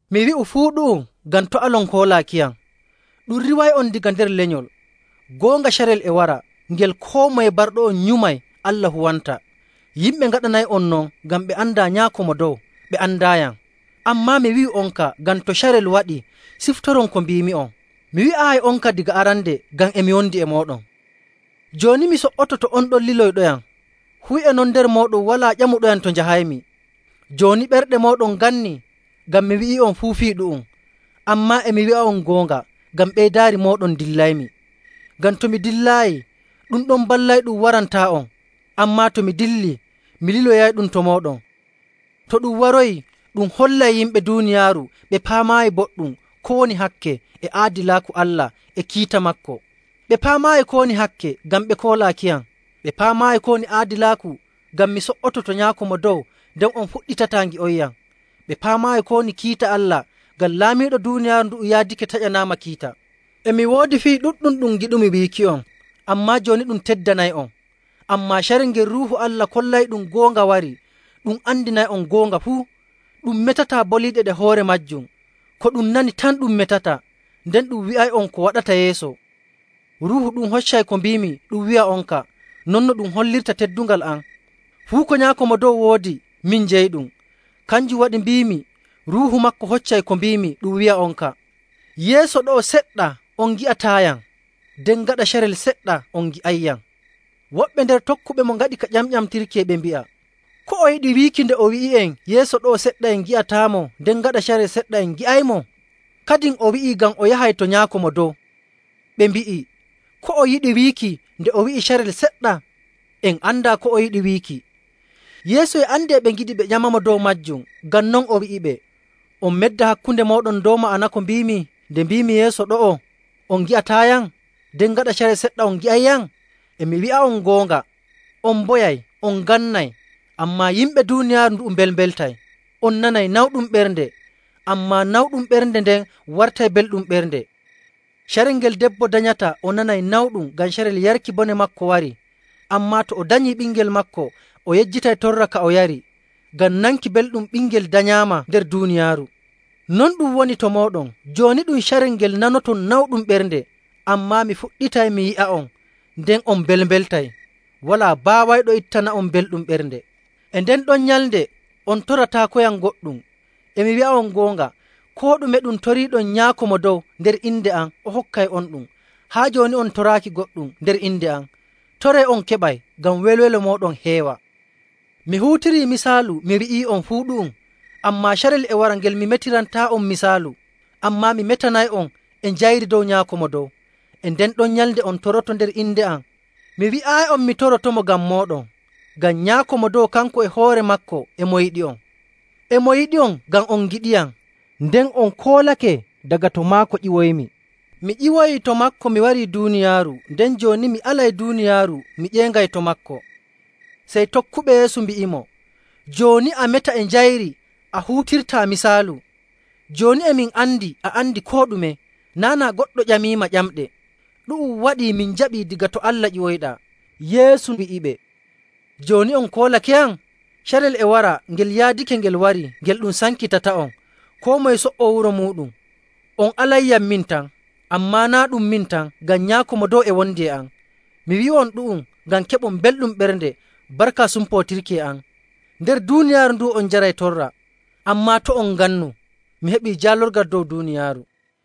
“Mi wi'u fuu ɗu'um ngam to' alon hoolaakiyam. Ɗum riiway'on daga nder lenyol. Goonga, carel e wara ngel koo moye barɗo'on nyumay Allah huwanta. Yimɓe ngaɗanay'on non ngam ɓe andaa Nyaako Mo Dow, ɓe andaayam. Ammaa mi wi'u'onka ngam to carel ngel waɗii ciftoron ko mbiimi'on. Mi wi'aayi'onka daga arande ngam e mi wondi e mooɗon. “Jooni mi so''oto to on ɗon liloyɗoyam, fuu e non nder mooɗon walaa ƴamuɗoyam to njahaymi. Jooni ɓerɗe mooɗon ngannii ngam mi wi'ii'on fuu fii ɗu'um. Ammaa e mi wi'a'on goonga, ngam ɓeydaari mooɗon ndillaymi. Ngam to mi dillaayi, ɗum ɗon Ballayɗum: Waato Ruuhu Allah. warantaa'on. Ammaa to mi dillii, mi liloyayɗum to mooɗon. To ɗum waroyii, ɗum hollay yimɓe duuniyaaru ɓe paamaayi boɗɗum ko woni hakke, e aadilaaku Allah, e kiita maako. Ɓe paamaayi ko woni hakke, ngam ɓe koolaakiyam. Ɓe paamaayi ko woni aadilaaku, ngam mi so''oto to Nyaako Mo Dow, nden on puɗɗitataa ngi'onyam. Ɓe paamaayi ko woni kiita Allah, ngam laamiiɗo duuniyaaru ndu'u yaadake taƴanaama kiita. “E mi woodi fii ɗuɗɗum ɗum ngiɗumi wiiki'on, ammaa jooni ɗum teddanay'on. Ammaa carel ngel Ruuhu Allah kollayɗum goonga warii, ɗum andinay'on goonga fuu. Ɗum metataa boliiɗe ɗe hoore maajum, ko ɗum nani tan ɗum metata, nden ɗum wi'ay'on ko waɗata yeeso. Ruuhu ɗum hoccay ko mbiimi ɗum wi'a'onka, non ɗum hollirta teddungal am. Fuu ko Nyaako Mo Dow woodi, min jeyiɗum. Kanjum waɗi mbiimi Ruuhu maako hoccay ko mbiimi ɗum wi'a'onka. “Yeeso ɗo'o seɗɗa on ngi'ataayam, nden gaɗa carel seɗɗa on ngi'ayyam.” Woɓɓe nder tokkuɓemo ngaɗi ka ƴamƴamtirki e ɓe mbi'a, “Ko o yiɗi wiiki nde o wi'i'en yeeso ɗo'o seɗɗa en ngi'ataamo, nden gaɗa carel seɗɗa en ngi'aymo? Kadin o wi'i ngam o yahay to Nyaako Mo Dow.” Ɓe mbi'i, “Ko o yiɗi wiiki nde o wi'i, ‘carel seɗɗa?’ En andaa ko o yiɗi wiiki.” Yeesu e andi e ɓe ngiɗi ɓe ƴamamo dow maajum, ngam non o wi'iɓe, “On medda hakkunde mooɗon dow ma'ana ko mbiimi nde mbiimi, ‘Yeeso ɗo'o on ngi'ataayam, nden gaɗa carel seɗɗa on ngi'ayyam?’ E mi wi'a'on goonga, on mboyay, on ngannay, ammaa yimɓe duuniyaaru mbelmbeltay. On nanay nawɗum ɓernde, ammaa nawɗum ɓernde nden wartay belɗum ɓernde. Carel ngel debbo danyata o nanay nawɗum, ngam carel yarki bone maako warii. Ammaa to o danyii ɓingel maako, o yejjitay torra ka o yari, ngam nanki belɗum ɓingel danyaama nder duuniyaaru. Non ɗum woni to mooɗon. Jooni ɗum carel ngel nanoton nawɗum ɓernde, ammaa mi fuɗɗitay mi yi'a'on, nden on mbelmbeltay. Walaa baawayɗo ittana'on belɗum ɓernde. “E nden ɗon nyalnde, on torataakoyam goɗɗum. E mi wi'a'on goonga, koo ɗume ɗum toriiɗon Nyaako Mo Dow nder inde am, o hokkay'onɗum. Haa jooni on toraaki goɗɗum nder inde am. Toree on keɓay, ngam welwelo mooɗon heewa. “Mi huutirii misaalu mi wi'ii'on fuu ɗu'um. Ammaa carel e wara ngel mi metirantaa'on misaalu, ammaa mi metanay'on e njayri dow Nyaako Mo Dow. E nden ɗon nyalnde on toroto nder inde am. Mi wi'aayi'on mi torotomo ngam mooɗon. Ngam Nyaako Mo Dow kanko e hoore maako e mo yiɗi'on. E mo yiɗi'on ngam on ngiɗiyam, nden on koolake daga to maako ƴiwoymi. Mi ƴiwoyii to maako mi wari duuniyaaru, nden jooni mi alay duuniyaaru mi ƴeeŋay to maako.” Sey tokkuɓe Yeesu mbi'imo, “Jooni a meta e njayri a huutirtaa misaalu. Jooni e min andi a andi koo ɗume, naa' naa goɗɗo ƴamiima ƴamɗe. Ɗu'um waɗii min njaɓi daga to Allah ƴiwoyɗaa.” Yeesu wi'iɓe, “Jooni on koolakeyam? Carel e wara ngel yaadake ngel wari ngel ɗum sankitata'on, koo moye so''oo wuro muuɗum. On alayyam min tan. Ammaa naa' ɗum min tan, ngam Nyaako Mo Dow e wondi e am. Mi wi'u'on ɗu'um ngam keɓon belɗum ɓernde barka sumpootirki e am. Nder duuniyaaru ndu'u on njaray torra. Ammaa to' on ngannu, mi heɓii jaalorgal dow duuniyaaru.”